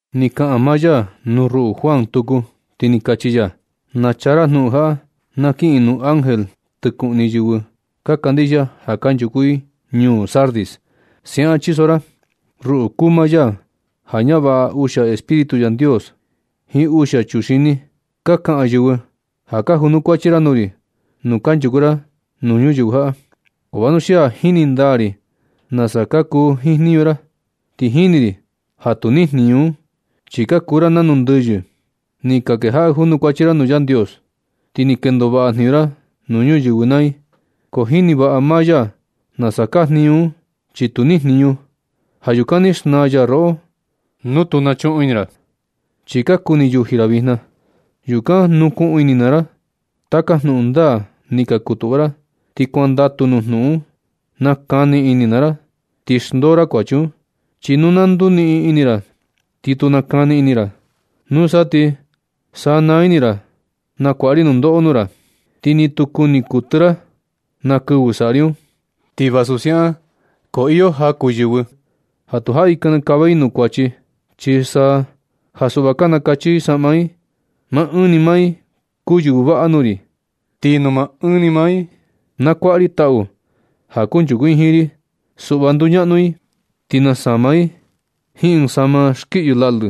Ni kaꞌan maa ya nuu ruꞌu Juan tuku, ti ni kachi ya: ―Na chaa ra jnuꞌun jaꞌa na kiꞌin nuu ángel tɨkuꞌni yɨvɨ ka kandixia ja kanchuku i ñuu Sardis. Siaꞌan chiso ra: “Ruꞌu kuu maa ya ja ñavaꞌa uxia espíritu Yandios jiin uxia chuxini. Ka kaꞌan yɨvɨ ja ka junukuachi ra nuu ri nu kanchuku ra nuu ñuyɨvɨ jaꞌa, ko vanuxia jini ndaa ri nasa kuu jiin jniñu ra, ti jini ri ja tu nijniñu un, chi ka kuu ra nanu ndɨyɨ. Ni ka kejaꞌa junukuachi ra nuu Yandios, ti ni kendo vaꞌa jniñu ra nuu yɨvɨ naa i, ko jini vaꞌa maa ya nasa kaa jniñu un, chi tu nijniñu. Ja yukan ti xnaa ya roꞌo nu tu nachuꞌun ini ra. Chi ka kuni yuji ra vijna. Yukan nukuꞌun ini naa ra taka jnuꞌun ndaa ni ka kutuꞌva ra. Ti kuandatu nuu jnuꞌun un, nakani ini naa ra ti xndoo ra kuachi un. Chi nu na nduniꞌin ini ra ti tu nakani ini ra, nusa ti sanaa ini ra na kuaꞌa ri nundoꞌo nuu ra, ti ni tu kuni kuɨtɨ ra na kɨvɨ saꞌa ri un. Ti vasu siaꞌan ko iyo jaku yɨvɨ un ja tu jaꞌi kinikava i nuu kuachi. Chi saa ja suꞌva ka nakacha i saꞌma i. Maa ɨɨn ni maa i kuu yɨvɨ vaꞌa nuu ri. Ti nuu maa ɨɨn ni maa i nakuaꞌa ri taꞌu ja kunchuku i jiin ri. Suꞌva nduñaꞌnu i, ti nasama i jiin ɨɨn saꞌma skiyɨ laꞌlɨ,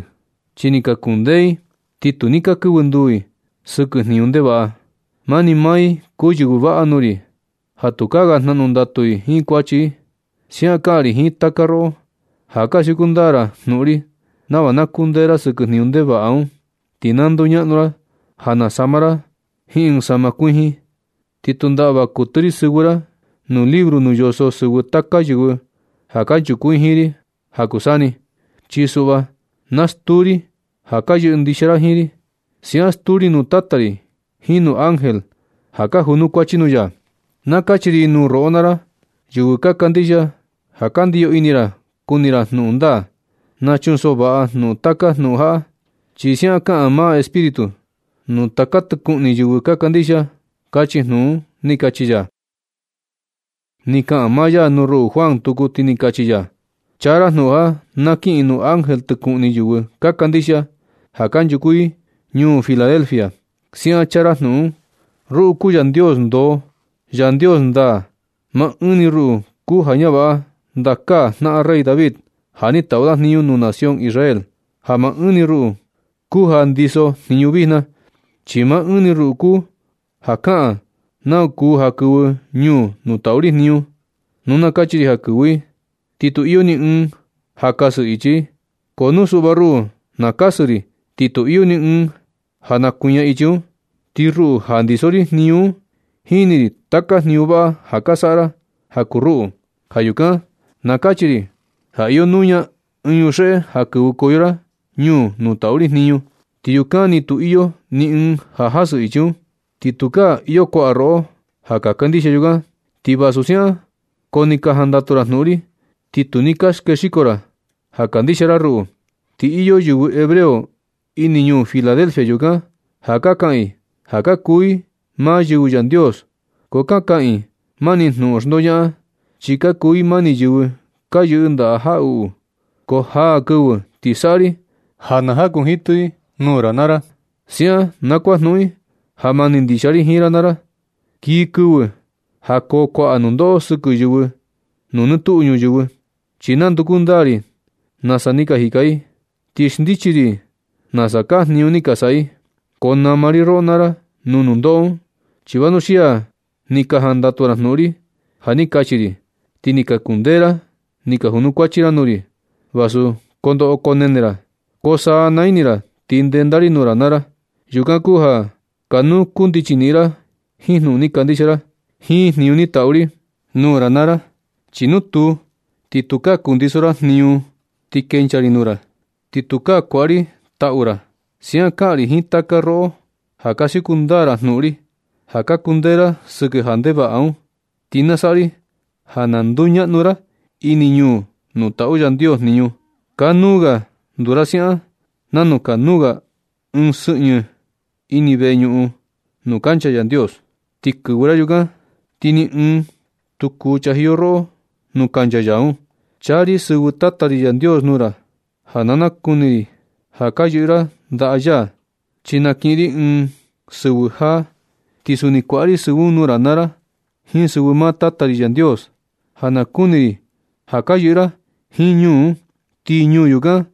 chi ni ka kundee i, ti tu ni ka kɨvɨ nduu i sɨkɨ jniñu ndevaꞌa. Mani maa i kuu yɨvɨ vaꞌa nuu ri, ja tukaa ga jnaꞌnu ndatu i jiin kuachi i. Siaꞌan kaꞌan ri jiin taka roꞌo ja ka siuku ndaa ra jnuꞌun ri nava na kundee ra sɨkɨ jniñu ndevaꞌa un, ti na nduñaꞌnu ra ja nasama ra jiin ɨɨn saꞌma kuijin. Ti tu ndaꞌva kuɨtɨ ri sɨvɨ ra nuu libro nuu yoso sɨvɨ taka yɨvɨ ja kunchuku i jiin ri ja kuu saa ni. Chi suꞌva na stuu ri ja ka yɨꞌɨ ndixia ra jiin ri. Siaꞌan stuu ri nuu Tata ri jiin nuu ángel ja ka junukuachi nuu ya. Na kachi ri nuu roꞌo naa ra, yɨvɨ ka kandixia ja ka ndiyo ini ra kuni ra jnuꞌun ndaa. Na chunsoꞌo vaꞌa ra nuu taka jnuꞌun jaꞌa, chi siaꞌan kaꞌan maa Espíritu nuu taka tɨkuꞌni yɨvɨ ka kandixia”, kachi jnuꞌun ―ni kachi ya. Ni kaꞌan maa ya nuu ruꞌu Juan tuku, ti ni kachi ya: ―Chaa ra jnuꞌun jaꞌa na kiꞌin nuu ángel tɨkuꞌni yɨvɨ ka kandixia ja kanchuku i ñuu Filadelfia. Siaꞌan chaa ra jnuꞌun un: “Ruꞌu kuu Yandios ndoo, Yandios ndaa. Maa ɨɨn ni ruꞌu kuu ja ñavaꞌa ndakaa jnaꞌan rey David ja ni taꞌu da jniñu nuu nación Israel, ja maa ɨɨn ni ruꞌu kuu ja ndiso jniñu vijna, chi maa ɨɨn ni ruꞌu kuu ja kaꞌan nau kuu ja kɨvɨ ñuu nuu taꞌu ri jniñu. Nu na kachi ri ja kɨvɨ i, ti tu iyo ni ɨɨn ja kasɨ ichi i. Ko nu suꞌva ruꞌu na kasɨ ri, ti tu iyo ni ɨɨn ja nakuiña ichi un. Ti ruꞌu ja ndiso ri jniñu un, jini ri taka jniñu vaꞌa ja ka saꞌa ra ja kuu ruꞌu. Ja yukan na kachi ri ja iyo nuña ɨɨn yuxeꞌe ja kɨvɨkoyo ra ñuu nuu taꞌu ri jniñu, ti yukan ni tu iyo ni ɨɨn ja kasɨ i ichi un. Ti tukaa iyo kuaꞌa roꞌo ja ka kandixia yukan. Ti vasu siaꞌan ko ni ka jandatu ra jnuꞌun ri, ti tu ni ka skexiko ra ja kandixia ra ruꞌu. Ti iyo yɨvɨ hebreo ini ñuu Filadelfia yukan ja kaꞌan i ja ka kuu i maa yɨvɨ Yandios, ko ka kaꞌan i mani jnuꞌun xndoñaꞌan, chi ka kuu i mani yɨvɨ ka yɨꞌɨ ndaꞌa jaꞌuꞌu. Ko jaa kɨvɨ ti saꞌa ri ja na jakuɨñɨjitɨ i nuu ra naa ra. Siaꞌan na kuajnuꞌun i ja mani ndixia ri jiin ra naa ra. Kii kɨvɨ ja koo kuaꞌa nundoꞌo sɨkɨ yɨvɨ nuu nɨ tuꞌu ñuyɨvɨ, chi nanduku ndaa ri nasa ni ka jika i ti xndichi ri i nasa kaa jniñu ni ka saꞌa i. Ko nama ri roꞌo naa ra nuu nundoꞌo un, chi vanuxia ni ka jandatu ra jnuꞌun ri ja ni kachi ri, ti ni ka kundee ra ni ka junukuachi ra nuu ri, vasu koo ndoꞌo koo nene ra. Ko sanaa ini ra ti ndenda ri nuu ra naa ra. Yukan kuu ja kanuu kundichi niꞌin ra jiin jnuꞌun ni kandixia ra, jiin jniñu ni tatu ri nuu ra naa ra. Chi nu tuu, ti tukaa kundiso ra jniñu un ti kenchaa ri nuu ra, ti tukaa kuaꞌa ri taꞌu ra. Siaꞌan kaꞌan ri jiin taka roꞌo ja ka siuku ndaa ra jnuꞌun ri, ja ka kundee ra sɨkɨ ja ndevaꞌa un. Ti na saꞌa ri ja nduñaꞌnu ra ini ñuu nuu taꞌu Yandios jniñu. Kanuu ga nduu ra siaꞌan nanu kanuu ga ɨɨn sɨꞌnɨ ini veñuꞌun nuu kancha Yandios. Ti kɨvɨ ra yukan, ti ni ɨɨn tu kuu chajiyo roꞌo nuu kancha ya un. Chaa ri sɨvɨ Tata ri Yandios nuu ra ja na nakuni ri ja ka yɨꞌɨ ra ndaꞌa ya. Chi na kiꞌin ri ɨɨn sɨvɨ jaa, ti suni kuaꞌa ri sɨvɨ un nuu ra naa ra jiin sɨvɨ maa Tata ri Yandios, ja nakuni ri ja ka yɨꞌɨ ra jiin ñuu un. Ti ñuu yukan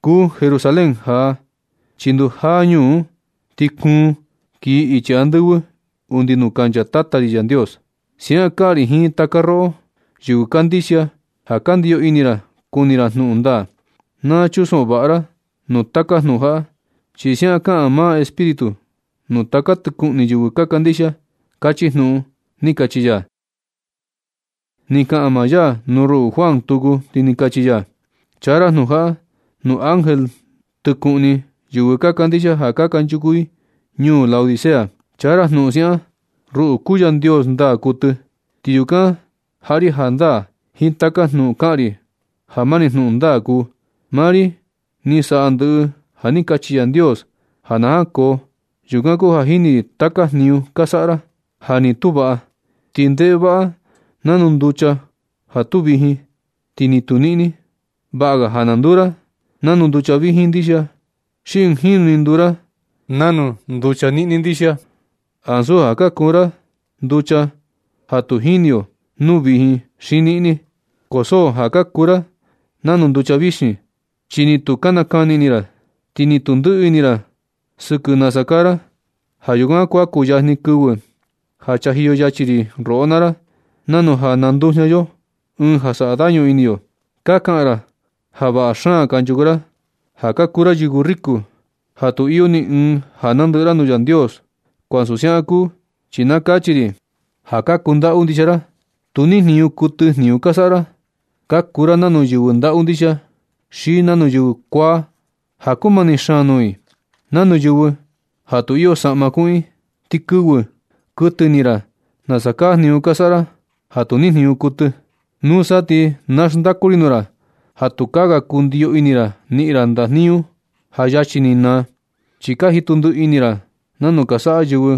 kuu Jerusalén jaa, chi ndujaa ñuu un ti kuun kiji ichi andɨvɨ undi nuu kancha Tata ri Yandios. Siaꞌan kaꞌan ri jiin taka roꞌo, yɨvɨ kandixia ja ndiyo ini ra kuni ra jnuꞌun ndaa. Na chunsoꞌo vaꞌa ra nuu taka jnuꞌun jaꞌa, chi siaꞌan kaꞌan maa Espíritu nuu taka tɨkuꞌni yɨvɨ ka kandixia”, kachi jnuꞌun ―ni kachi ya. Ni kaꞌan maa ya nuu ruꞌu Juan tuku, ti ni kachi ya: ―Chaa ra jnuꞌun jaꞌa nuu ángel tɨkuꞌni yɨvɨ ka kandixia ja kanchuku i ñuu Laodicea. Chaa ra jnuꞌun siaꞌan: “Ruꞌu kuu Yandios ndaa kuɨtɨ, ti yukan jaꞌa ri jandaa jiin taka jnuꞌun kaꞌan ri ja mani jnuꞌun ndaa kuu. Maa ri ni saꞌa ndɨꞌɨ ja ni kachi Yandios ja na jankoo. Yukan kuu ja jini ri taka jniñu ka saꞌa ra, ja ni tu vaꞌa ti ndevaꞌa, nanu nducha ja tu vijin ti ni tu niꞌni. Vaꞌa ga ja na nduu ra nanu nducha vijin ndixia xi ɨɨn jinu ni nduu ra nanu nducha niꞌni ndixia, ansu ja kuu ra nanu nducha ja tu jini yo nu vijin xi niꞌni. Ko so ja ka kuu ra nanu nducha vixin, chi ni tu nakani ini ra, ti ni tu ndɨꞌɨ ini ra sɨkɨ nasa kaa ra. Ja yukan kuan kuyajni kɨvɨ ja chajiyo yachi ri roꞌo naa ra, nanu ja nandujña yo ɨɨn ja saꞌa dañu ini yo. Ka kaꞌan ra ja vaꞌa xaan kanchuku ra, ja ka kuu ra yɨvɨ riku, ja tu iyo ni ɨɨn ja nandɨꞌɨ ra nuu Yandios. Ko ansu siaꞌan kuu, chi na kachi ri ja ka kundaꞌu ndixia ra. Tu nijniñu kuɨtɨ jniñu ka saꞌa ra. Ka kuu ra nanu yɨvɨ ndaꞌu ndixia, xi nanu yɨvɨ kuaa, ja kumani xaan nuu i, nanu yɨvɨ ja tu iyo saꞌma kuꞌun i. Tu kɨvɨ kuɨtɨ ini ra nasa kaa jniñu ka saꞌa ra, ja tu nijniñu kuɨtɨ. Nusa ti na xndaku ri nuu ra ja tukaa ga kundiyo ini ra niꞌin ra ndajniñu ja yachi ni naa, chi ka jitu ndiꞌi ini ra nanu ka saꞌa yɨvɨ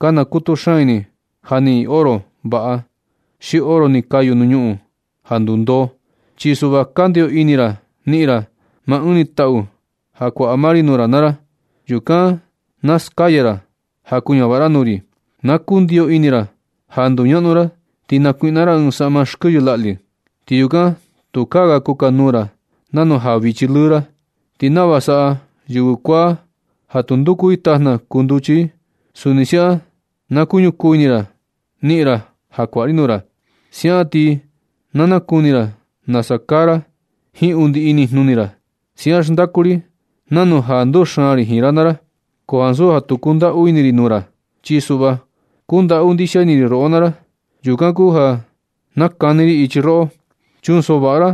ka nakutu xaan ini ja niꞌin i oro vaꞌa, xi oro ni kayu nuu ñuꞌun ja ndundoo. Chi suꞌva na kundiyo ini ra niꞌin ra maa ɨɨn ni taꞌu ja kuaꞌa maa ri nuu ra naa ra. Yukan na naskaya ra ja kuñavaꞌa ra nuu ri. Na kundiyo ini ra ja nduñaꞌnu ra ti nakuiꞌna ra ɨɨn saꞌma skɨyɨ laꞌlɨ. Ti yukan tukaa ga kukanuu ra nanu ja vichi lɨɨ ra. Ti nava saꞌa yɨvɨ kuaa ja nduku i tajna kuu nduchi i, suni siaꞌan na kuñukuu ini ra niꞌin ra ja kuaꞌa ri nuu ra. Siaꞌan ti na nakuni ra nasa kaa ra jiin undi inijnuni ra. Siaꞌan xndaku ri nanu ja nduxaan ri jiin ra naa ra. Ko ansu ja tu kundaꞌu ini ri nuu ra, chi suꞌva kundaꞌu ndixia ini ri roꞌo naa ra. Yukan kuu ja nakani ichi ri roꞌo. Chunsoꞌo vaꞌa ra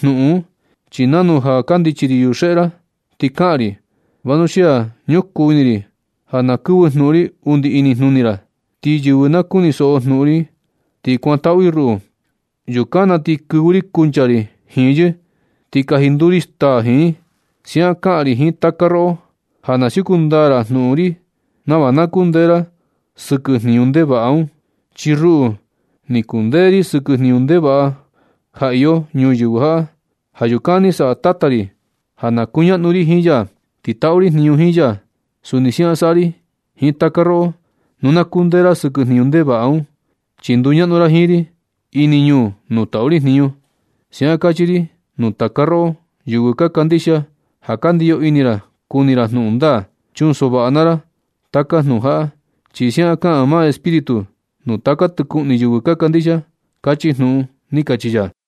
jnuꞌun un, chi nanu ja kandichi ri yuxeꞌe ra ti kaꞌan ri, vanuxia ñukuu ini ri ja na kɨvɨ jnuꞌun ri undi inijnuni ra. Ti yɨvɨ na kunisoꞌo jnuꞌun ri ti kuantaꞌu i ruꞌu, yukan na ti kɨvɨ ri kunchaa ri jiin yɨ ti kaji nduu ri staa jiin i. Siaꞌan kaꞌan ri jiin taka roꞌo ja na siuku ndaa ra jnuꞌun ri nava na kundee ra sɨkɨ jniñu ndevaꞌa un. Chi ruꞌu, ni kundee ri sɨkɨ jniñu ndevaꞌa ja iyo ñuyɨvɨ jaꞌa. Ja yukan ni saꞌa Tata ri ja na kuñaꞌnu ri jiin ya, ti taꞌu ri jniñu jiin ya. Suni siaꞌan saꞌa ri jiin taka roꞌo nu na kundee ra sɨkɨ jniñu ndevaꞌa un, chi nduñaꞌnu ra jiin ri ini ñuu nuu taꞌu ri jniñu. Siaꞌan kachi ri nuu taka roꞌo, yɨvɨ ka kandixia ja ka ndiyo ini ra kuni ra jnuꞌun ndaa. Chunsoꞌo vaꞌa naa ra taka jnuꞌun jaꞌa, chi siaꞌan kaꞌan maa Espíritu nuu taka tɨkuꞌni yɨvɨ ka kandixia”, kachi jnuꞌun ―ni kachi ya.